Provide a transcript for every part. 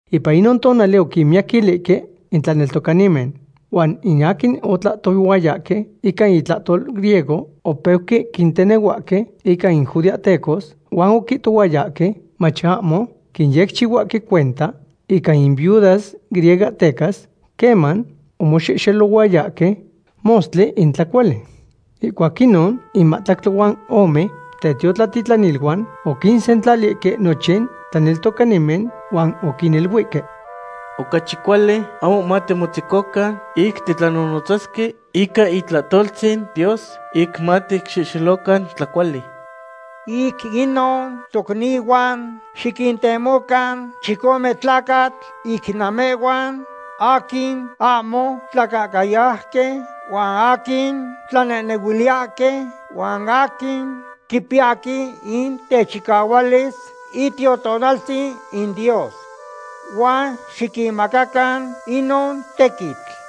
Ipan inon tonali oquimiyaquilihque in tlaneltocanimen. Huan in aquin otlahtohuayahque ica intlahtol griego opeuque quintenehuahque ica in judeahtecos, huan oquihtohuayahque mach ahmo quinyecchihuahque cuenta ica in viudas griegohtecas queman omoxehxelohuayahque mostli in tlacuali. Ihcuac inon in mahtlactli huan ome tetiotlatitlaniluan oquinsentlalihque nochin tlaneltocanimen huan oquiniluihque: ―Ocachi cuali ahmo matimotzecocan ic titlanonotzasque ica itlahtoltzin Dios ic maticxehxelocan tlacuali. Ic inon, tocnihuan, xiquintemocan chicome tlacatl ic namehhuan, aquin ahmo tlacahcayauqui, huan aquin tlanehnehuiliyahque, huan aquin quipiyahque in techicahualis Itiotonaltzin in Dios. Huan xiquinmacacan inon tequitl.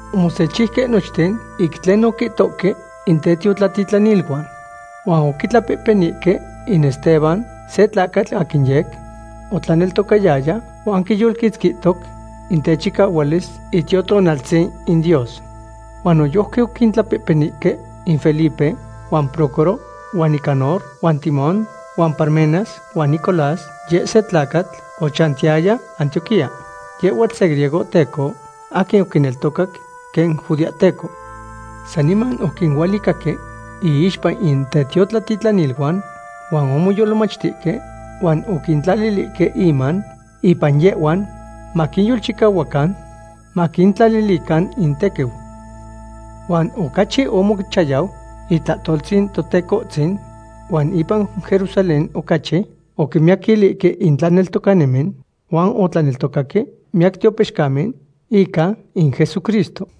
Omosechiuque nochten ic tlen oquihtohque in tetiotlatitlaniluan, huan oquitlapehpenihque in Esteban, se tlacatl aquin yec otlaneltocayaya huan quiyolquitzquihtoc in techicahualis Itiotonaltzin in Dios. Huan noyojqui oquintlapehpenihque in Felipe, huan Prócoro, huan Nicanor, huan Timón, huan Parmenas, huan Nicolás, yeh se tlacatl ochantiyaya Antioquía. Yehhuatl se griegohteco aquin oquineltocac quen judeahteco. Saniman oquinualicahque iixpa in tetiotlatitlaniluan huan omoyolmachtihque huan oquitlalihque inman ipan yehhuan, maquinyolchicahuacan maquintlalilican intequiu. Huan ocachi omochayau itlahtoltzin Totecohtzin huan ipan Jerusalén ocachi oquimiyaquilihque in tlaneltocanimen, huan otlaneltocaque miyac tiopixcamen ica in Jesucristo.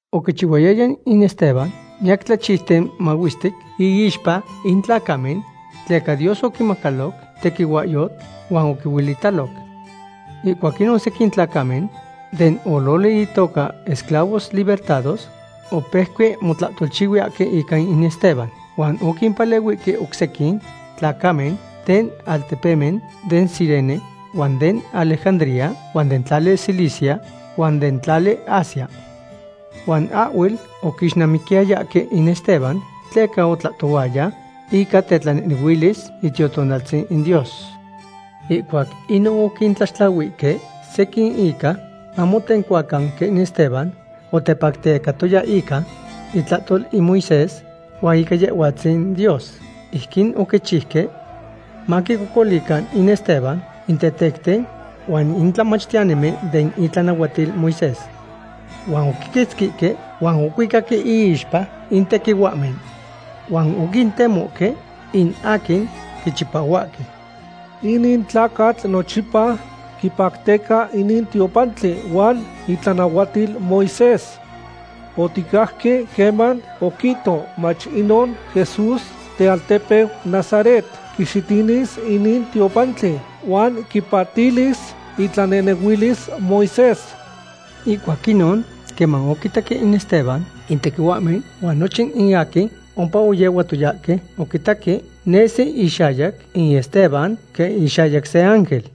Oquichihuayaya in Esteban miyac tlachiuten mahuestic iixpa in tlacamen, tleca Dios oquimacaloc tequihuahyotl huan oquihuelitaloc. Ihcuac inon sequin tlacamen den ololi itoca Esclavos Libertados opeuque motlahtolchihuiyahque ica in Esteban. Huan oquimpalehuihque oc sequin tlacamen den altepemen den Cirene, huan den Alejandría, huan den tlali Cilicia, huan den tlali Asia. Huan ahhuel oquixnamiquiyayahque in Esteban tleca otlahtohuaya ica tetlanehnehuilis Itiotonaltzin in Dios. Ihcuac inon oquintlaxtlahuihque sequin ica mamotencuacan quen Esteban otepactecatoya ica itlahtol in Moisés huan ica Yehhuatzin Dios. Ijquin oquichiuque maquicocolican in Esteban in tetecten huan in tlamachtiyanimen den itlanahuatil Moisés. Huan oquiquitzquihque huan ocuicaque iixpa in tequihuahmen. Huan oquintemohque in aquin quichipahuahque: ―Inin tlacatl nochipa quipacteca inin tiopantli huan itlanahuatil Moisés. Oticajque queman oquihto mach inon Jesús tealtepeu Nazaret quixitinis inin tiopantli huan quipatilis itlanehnehuilis Moisés. Ihcuac inon, queman oquitaque in Esteban in tequihuahmen huan nochin in aquin ompa oyehuatoyahque, oquitaque nesi ixayac in Esteban quen ixayac se ángel.